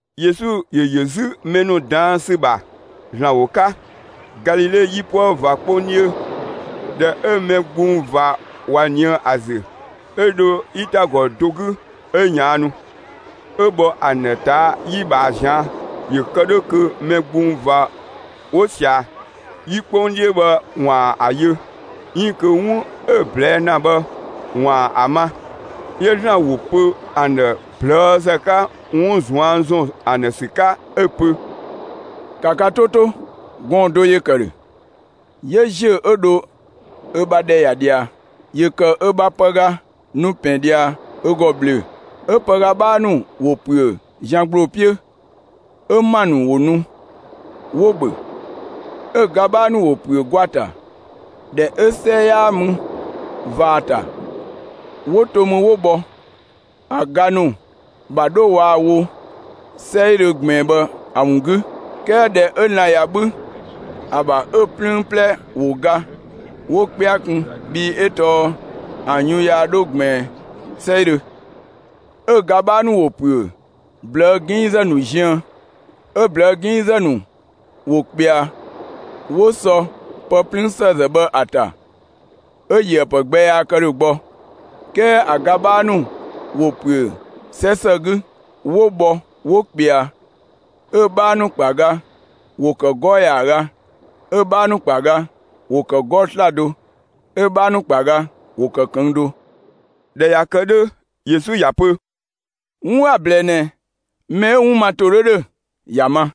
Yesu ‑yö ‑yö 'zü mɛ ‑nu ꞊daan' ‑sü ‑bha ‑Zlan ‑wo 'ka, Galile 'yipuë ꞊va 'kpong 'dhiö. ꞊Dhɛ 'ö mɛ gbung ꞊va ꞊wa ꞊nië' ‑a ‑zü, 'ö dho 'yitagɔ do 'gü 'ö ꞊yaannu, 'ö bhɔ ‑an ‑dhë ꞊taa' 'yi ꞊bhaa ꞊zian'; ‑yö kë 'dhö kö mɛ gbung ꞊va 'wo sia‑ 'yi 'kpong 'dhiö bhë ‑waan ‑a yö, 'iin kö 'wun 'ö‑ ꞊blɛɛ' ‑na bhë ‑waan ‑a ma. 'Yö ‑Zlan ‑wo pö ‑an ‑dhë ꞊plëëzë 'ka 'wun ꞊zuan' ‑zɔn ‑an ‑dhë ‑sü 'ka, 'ö‑ pö: «‑Ka ka 'to 'to, gɔɔn‑ do ‑yö ‑kë ‑dhö, 'yö ‑ziö 'ö dho ö bha ‑dhɛ ‑ya ꞊dhia. ‑Yö ‑kë ö ‑bha pëga ‑nu ‑pɛn ꞊dhia ö ‑gɔ ꞊bhlöö‑, 'ö pëga 'bhaa ‑nu ‑wo ‑püö zian ‑gbloo 'piö, 'ö ‑ma ‑nu ‑wo nu 'wo‑ ‑bhö. 'Ö‑ ga 'bhaa ‑nu ‑wo ‑püö gwa ‑ta, ‑dhɛ 'ö 'sɛ 'yaa mü ꞊va ‑a ‑ta. 'Wo to mü 'wo bhɔ ‑a ga ‑nu ‑bha 'dho waa‑ wo 'sɛidhö ꞊gbiin bhë ‑a ‑wun 'gü. 'Kɛɛ ‑dhɛ 'ö lan‑ ꞊ya 'bhü ‑a ‑bha 'ö‑ 'plüün 'plɛ ‑wo ga, 'wo 'kpɛa kun, bhii 'ö tɔɔ ‑an yun yaa 'dho ꞊gbiin 'sɛidhö. 'Ö‑ ga 'bhaa ‑nu ‑wo ‑püö ꞊blëë' 'ginngzë ‑nu ziën, 'ö ꞊blëë' 'ginngzë ‑nu ‑wo ꞊kpɛa 'ö 'wo sɔ pë 'plüün ‑sëëzë bhë ‑a ‑ta 'ö‑ ‑yöë ‑pë gbɛ yaa kë ‑dhö gbɔ. 'Kɛɛ ‑a ga 'bhaa ‑nu ‑wo ‑püö 'sɛ ‑së 'gü, 'wo bhɔ 'wo ꞊kpɛa. 'Ö‑ 'bhaa ‑nu ‑kpa ga ‑wo ‑kë 'gɔɔ‑ ‑yaaga, 'ö‑ 'bhaa ‑nu ‑kpa ga ‑wo ‑kë 'gɔɔ‑ 'slado, 'ö‑ 'bhaa ‑nu ‑kpa ga ‑wo ‑kë ꞊këng' do.» ꞊Dhɛ ꞊ya kë 'dhö, Yesu ‑ya pö: «'Wun 'a‑ ꞊blɛɛ ꞊nɛ mɛ 'ö‑ 'wun ma ‑to 'dhö ‑dhö ‑ya ma!»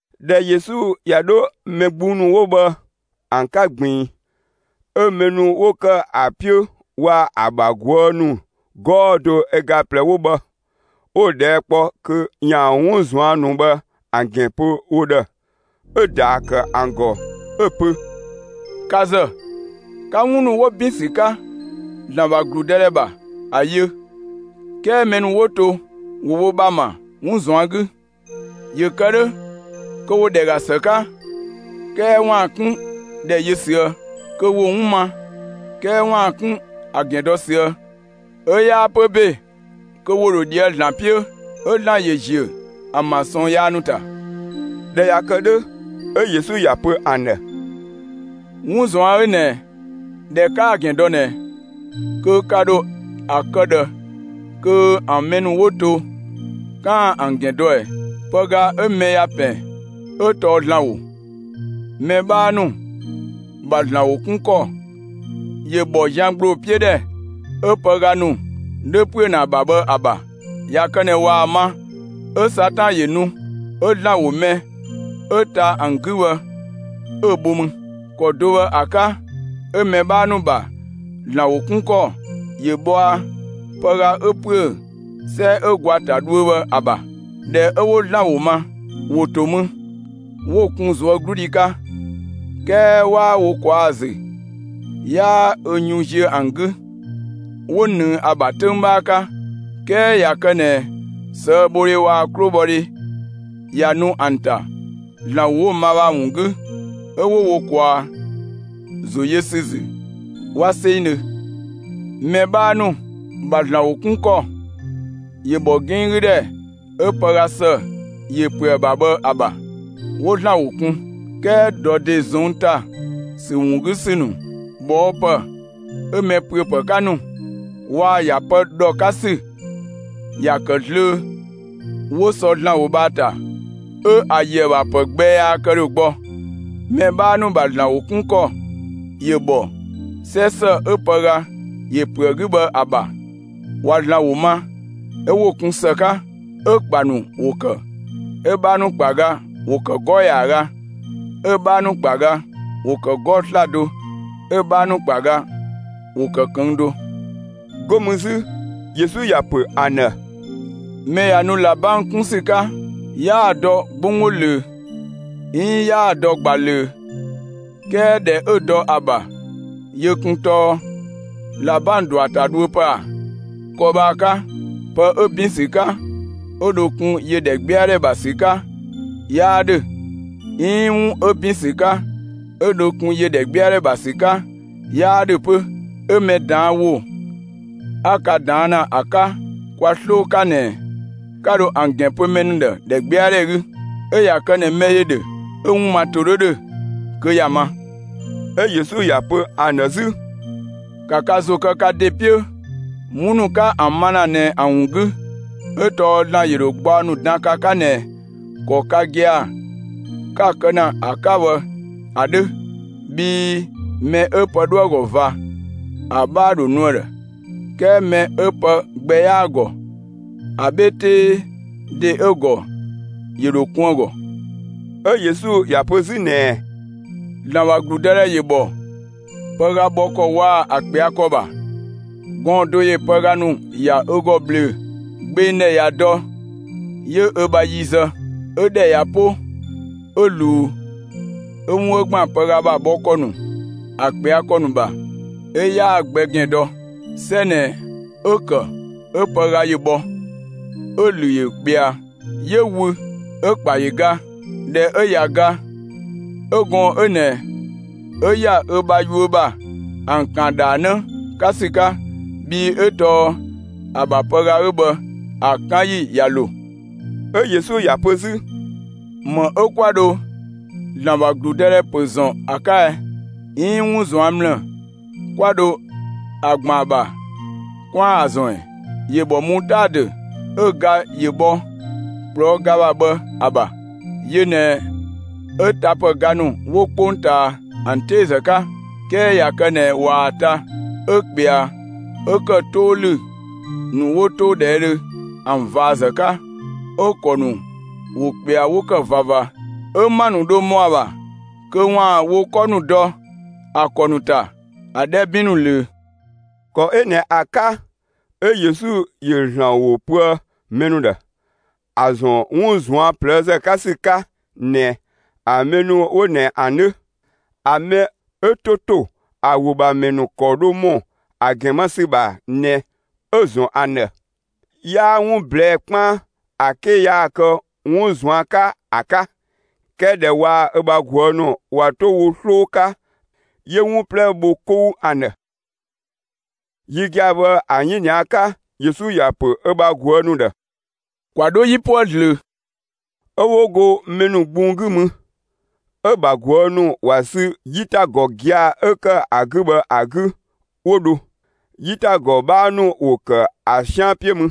꞊Dhɛ Yesu ꞊ya 'dho mɛ gbung ‑nu 'wo bhë ‑an 'ka ꞊gbiin, 'ö mɛ ‑nu 'wo ‑kë ‑a 'piö waa‑ ‑a ‑bha ꞊guë' ‑nu 'gɔɔ‑ do ö ga ꞊plɛ 'wo bhë, 'wo‑ ꞊dhɛɛ' kpɔ kö ‑yaan 'wun ꞊zuan' ‑nu bhë ‑an ‑gɛn pö wo ‑dhë. 'Ö‑ ‑daa ‑kë ‑an ‑gɔ 'ö‑ pö: «Ka ‑zë, 'ka 'wun ‑nu 'wo ‑bin ‑sü 'ka ‑Zlan ‑bha ‑gludëdhɛ ‑bha ‑a yö, 'kɛɛ mɛ ‑nu 'wo to, ‑wo wo ‑bha ‑ma 'wun ꞊zuan' 'gü. ‑Yö kë 'dhö kö ‑wo ‑dhɛ ‑ga ‑së 'ka 'kɛɛ ‑waan 'kun ‑dhɛ yö ꞊süë'; kö ‑wo 'wun ma, 'kɛɛ ‑waan 'kun ‑a ‑gɛn dɔ ꞊süë'. 'Ö yaa pö ‑be kö ‑wo ‑dho ꞊dhië' ‑Zlan 'piö, 'ö ‑Zlan ‑yö ‑ziö ‑an ‑bha ꞊sɔɔn yaa ‑nu ‑ta.» ꞊Dhɛ ꞊ya kë 'dhö, 'ö Yesu ‑ya pö ‑an ‑dhë: «'Wun ꞊zuan' 'ö ꞊nɛ ꞊dhɛ 'kaa‑ ‑gɛn dɔ ꞊nɛ, kö ka ‑dho ‑a kë ꞊dhë kö ‑an mɛ ‑nu 'wo to 'kaan‑ ‑an ‑gɛn dɔ ꞊ɛ? Pëga 'ö mɛ ‑ya ‑pɛn 'ö tɔɔ ‑Zlan ‑wo. Mɛ 'bhaa ‑nu ‑bha ‑Zlan ‑wo 'kun ‑kɔ ‑yö ‑bhɔ zian ‑gbloo 'piö ‑dhɛ, 'ö pëga ‑nu 'dhö ‑püö ‑na ‑a ‑bha bhë ‑a ‑bha. ꞊Ya kë ꞊nɛ ꞊waa‑ ma, 'ö Satan ‑yö nu 'ö ‑Zlan ‑wo mɛ 'ö ta ‑an 'gü bhë 'ö‑ bho mü. ‑Kɔ do bhë ‑a 'ka 'ö mɛ 'bhaa ‑nu ‑bha ‑Zlan ‑wo 'kun ‑kɔ ‑yö bhɔa pëga 'ö ‑püö 'sɛ 'ö gwa ‑ta dhuö bhë ‑a ‑bha. ꞊Dhɛ 'ö 'wo ‑Zlan ‑wo ma, ‑wo ‑to mü 'wo‑ kun ꞊zuögludhi 'ka. 'Kɛɛ 'waa wo ꞊kwaa' ‑a ‑zü, 'yaa ö yun ziö ‑an 'gü. 'Wo ꞊nëng ‑a ‑bha 'töng 'bhaa 'ka; 'kɛɛ ꞊ya kë ꞊nɛ ꞊sëëbhodhe waa‑ 'klobhɔdhe ꞊ya nu ‑an ‑ta, ‑Zlan ‑wo 'wo‑ ma bhë ‑a ‑wun 'gü, 'ö 'wo wo ꞊kwaa ‑zo yö ‑sü ‑zü 'wa 'sengdhö. Mɛ 'bhaa ‑nu ‑bha ‑Zlan ‑wo 'kun ‑kɔ ‑yö bhɔ 'ginng 'gü ‑dhɛ 'ö pëga ‑së ‑yö ‑püö ‑a ‑bha, ‑a ‑bha. 'Wo ‑Zlan ‑wo kun, 'kɛɛ ‑dɔ ‑de ꞊zɔnng' ‑ta ‑sü ‑wun 'gü ‑sü ‑nu, ꞊bhɔɔpë 'ö‑ mɛ ‑püö ‑pë 'ka ‑nu waa‑ ‑ya pë ‑dhɔ 'ka ‑sü, ‑ya ‑kë zlöö 'wo sɔ ‑Zlan ‑wo bhë ‑a ‑ta 'ö ‑yö ‑a ‑bha ‑pë gbɛ yaa kë ‑dhö gbɔ. Mɛ 'bhaa ‑nu ‑bha ‑Zlan ‑wo 'kun ‑kɔ ‑yö ‑bhɔ 'sɛ ‑së 'ö pëga ‑yö ‑püö ‑a 'gü bhë ‑a ‑bha. ꞊Wa ‑Zlan ‑wo ma, 'ö 'wo‑ kun ‑së 'ka, 'ö‑ ‑kpa ‑nu ‑wo ‑kë. 'Ö‑ 'bhaa ‑nu ‑kpa ga ‑wo ‑kë 'gɔɔ‑ ‑yaaga, 'ö‑ 'bhaa ‑nu ‑kpa ga ‑wo ‑kë 'gɔɔ‑ 'slado, 'ö‑ 'bhaa ‑nu ‑kpa ga ‑wo ‑kë ꞊këng' do.» 'Go mü 'zü Yesu ‑ya ‑pö ‑an ‑dhë: «Mɛ ꞊ya nu ꞊labang 'kun ‑sü 'ka, 'yaa‑ dɔ 'gbonggbo ꞊löö; 'iin 'yaa‑ dɔ ꞊gba ꞊löö; 'kɛɛ ‑dhɛ 'ö‑ dɔ ‑a ‑bha 'yö kun tɔɔ ꞊labang ‑dɔ ‑a ‑ta dhuö ‑pë ‑a? ‑Kɔ bhë ‑a 'ka pë 'ö ‑bin ‑sü 'ka 'ö dho kun ‑yö ‑dhɛgbɛadhɛ ‑bha ‑sü 'ka 'yaa ‑dhö 'iin 'wun 'ö ‑bin ‑sü 'ka 'ö dho kun ‑yö ‑dhɛgbɛadhɛ ‑bha ‑sü 'ka 'yaa ‑dhö 'pö. 'Ö mɛ ꞊daan' ‑wo 'a ka ꞊daan' ‑na ‑a 'ka kwa 'sloo 'ka ꞊nɛ, 'ka dho ‑an ‑gɛn pö mɛ ‑nu ‑dhë ‑dhɛgbɛadhɛ 'gü. 'Ö ꞊ya kë ꞊nɛ mɛ ‑yö ‑dhö 'ö‑ 'wun ma ‑to 'dhö ‑dhö, kö ‑ya ma!» 'Ö Yesu ‑ya pö ‑an ‑dhë 'zü: «‑Ka ka ‑zo kë ka ‑de 'piö, 'wun ‑nu 'ka ‑an ma ‑na ꞊nɛ ‑an ‑wun 'gü! 'Ö tɔɔ ‑Zlan ‑yö ‑dho gbaɔ ‑nu dan ka 'ka ꞊nɛ ‑kɔ ka gia‑ 'ka‑ kë ‑na ‑a 'ka bhë ‑a 'dhö. Bhii mɛ 'ö pë 'dhoë‑ ‑gɔ ꞊va ‑a 'bhaa ‑dho nu ‑a ‑dhë, 'kɛɛ mɛ 'ö pë gbɛ 'yaa‑ ‑gɔ, ‑a 'bhe 'tee ‑de 'ö‑ ‑gɔ, ‑yö ‑dho kun ‑a ‑gɔ.» 'Ö Yesu ‑ya pö 'zü ꞊nɛɛ: «‑Zlan ‑bha ‑gludëdhɛ ‑yö ‑bhɔ pëga bhɔ ‑kɔ waa‑ ‑a ꞊kpɛa' ‑kɔ ‑bha. Gɔɔn‑ do ‑yö pëga ‑nu ‑ya ö ‑gɔ ꞊bhlöö‑. Gbeng ‑dhɛ ꞊ya dɔ 'yö ö bha yi zë, 'ö ‑dhɛ ꞊ya 'po 'ö ꞊luu, 'ö 'wun 'ö ‑gban pëga ‑bha bhɔ ‑kɔ ‑nu, ‑a ꞊kpɛa' ‑kɔ ‑nu ‑bha, 'ö 'yaa‑ gbɛ ‑gɛn dɔ. 'Sɛ ꞊nɛ 'ö‑ ‑kë 'ö pëga ‑yö bhɔ, 'ö‑ ‑lü ‑yö ꞊kpɛa, 'yö wü, 'ö‑ ‑kpa ‑yö ga. ꞊Dhɛ 'ö ꞊ya ga, 'ö gɔɔn‑ 'ö ꞊nɛ 'ö ‑ya ö bha yuö ‑bha ‑an ‑kan ‑dhaanë 'ka ‑sü 'ka, bhii 'ö tɔɔ ‑a ‑bha pëga 'ö bhë ‑a 'kan ‑yi ꞊ya ‑lo.» 'Ö Yesu ‑ya pö 'zü: «‑Më 'ö 'kwa dho ‑Zlan ‑bha ‑gludëdhɛ ‑pö ‑zɔn ‑a 'ka ɛ? 'Iin 'wun ꞊zuan' ‑mlë 'kwa dho ‑a ‑gban ‑a ‑bha 'kwaan‑ ‑a ‑zɔn ‑ɛ? ‑Yö ‑bhɔ mutaadö ('ö‑ ga ‑yö bhɔ ꞊kplɔɔ' ga ‑bha bhë ‑a) ‑bha; yö ꞊nɛ 'ö tapëga ‑nu 'wo 'kpongtaa ‑an 'teezë 'ka. 'Kɛɛ ꞊ya kë ꞊nɛ ꞊waa‑ ta, 'ö ꞊kpɛa 'ö ‑kë 'too ‑lü ‑nu 'wo 'toodhɛɛdhö ‑an ꞊vaazë 'ka. 'Ö‑ ‑kɔ ‑nu ‑wo ꞊kpɛa 'wo ‑kë ꞊vava, 'ö ‑ma ‑nu 'dho ‑mɔ ‑a ‑bha kö ‑waan wo 'kɔ ‑nu dɔ ‑a ‑kɔ ‑nu ‑ta ‑a 'dhɛ 'bin ‑nu ꞊löö.» ‑Kɔ 'ö ꞊nɛ ‑a 'ka 'ö Yesu ‑yö ‑Zlan ‑wo pöë mɛ ‑nu ‑dhë, ‑a ‑zɔn 'wun ꞊zuan' ꞊plëëzë 'ka ‑sü 'ka ꞊nɛ ‑a mɛ ‑nu 'wo ꞊nɛ ‑an 'dhö. ‑A mɛ 'ö 'to to ‑a ‑wo ‑bha ‑mɛ ‑nu ‑kɔ dho ‑mɔ ‑a ‑gɛn ma ‑sü ‑bha ꞊nɛ 'ö‑ ‑zɔn ‑an ‑dhë. 'Yaa 'wun ꞊blɛɛ'‑ 'kpaan ‑a 'ke yaa‑ kë 'wun ꞊zuan' 'ka ‑a 'ka, 'kɛɛ ꞊dhɛ waa‑ ö bha ꞊guë' ‑nu ꞊wa 'to wo 'sloo 'ka 'yö 'wun 'plɛ bho 'kou ‑an ‑dhë. Yi gia‑ bhë ‑a 'yinia 'ka, Yesu ‑ya ‑pö ö bha ꞊guë' ‑nu ‑dhë: «‑Kwa 'dho 'yipuë ꞊zlöö!» 'Ö 'wo go mɛ ‑nu gbung 'gü mü, 'ö‑ ‑bha ꞊guë' ‑nu ‑wa sü 'yitagɔ gia‑ 'ö ‑kë ‑a 'gü bhë ‑a 'gü, 'wo dho. 'Yitagɔ 'bhaa ‑nu ‑wo ‑kë ‑a 'sian 'piö mü.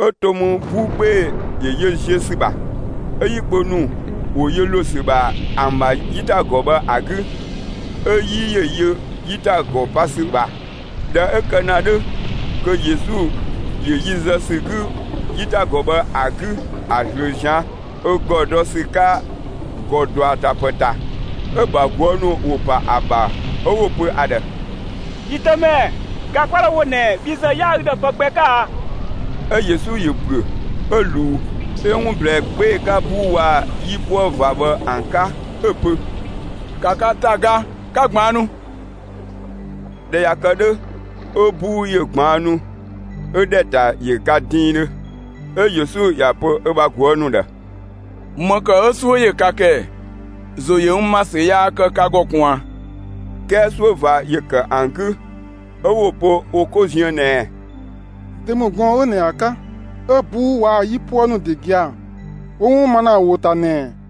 'Ö to mü 'buu 'gbee‑ ‑yö yö ziö ‑sü ‑bha, 'ö 'yi kpö ‑nu ‑wo yö ‑lo ‑sü ‑bha ‑an ‑bha 'yitagɔ bhë ‑a 'gü, 'ö 'yi ‑yö yö 'yitagɔ pa ‑sü ‑bha. ꞊Dhɛ 'ö kë ‑na 'dhö kö Yesu ‑yö yi zë ‑sü 'gü 'yitagɔ bhë ‑a 'gü ‑a ꞊zlöö ꞊zian' ö ‑gɔ dɔ ‑sü 'ka ‑gɔ ‑dɔatapë ‑ta. 'Ö‑ ‑bha ꞊guë' ‑nu ‑wo ‑pa ‑a ‑bha 'ö 'wo‑ pö ‑a ‑dhë: «Yi Dëmɛ, ga 'kwa 'dhoë‑ ‑a wo ꞊nɛ, bhi ‑zë 'yaa ü ‑dhë pë gbɛ 'ka a?» 'Ö Yesu ‑yö ‑büö 'ö ꞊luu 'ö 'wun ꞊blɛɛ 'gbee‑ 'ka 'buu waa‑ 'yipuë ꞊va bhë ‑an 'ka, 'ö‑ pö: «‑Ka ka ‑ta ga, 'ka ꞊gbaannu!» ꞊Dhɛ ꞊ya kë 'dhö, 'ö 'buu ‑yö ꞊gbaannu 'ö ‑dhɛ ‑ta ‑yö ga diindhö. 'Ö Yesu ‑ya pö ö bha ꞊guë' ‑nu ‑dhë: «‑Më ‑kë 'ö 'suö ‑yö ka ‑kë ‑ɛ? ‑Zo ‑yö n ‑ma ‑sü yaa kë ka ‑gɔ ꞊kun ꞊a?» 'Kɛɛ 'suö ꞊va ‑yö ‑kë ‑an 'gü, 'ö 'wo‑ pö wo 'ko ziën ꞊nɛɛ: «Dö ‑mü gɔɔn‑ 'ö ꞊nɛ ‑a 'ka, 'ö 'buu waa‑ 'yipuë ‑nu ‑de gia‑ 'wo 'wun ma ‑na ‑a ‑wo ‑ta ꞊nɛ ꞊ɛ?»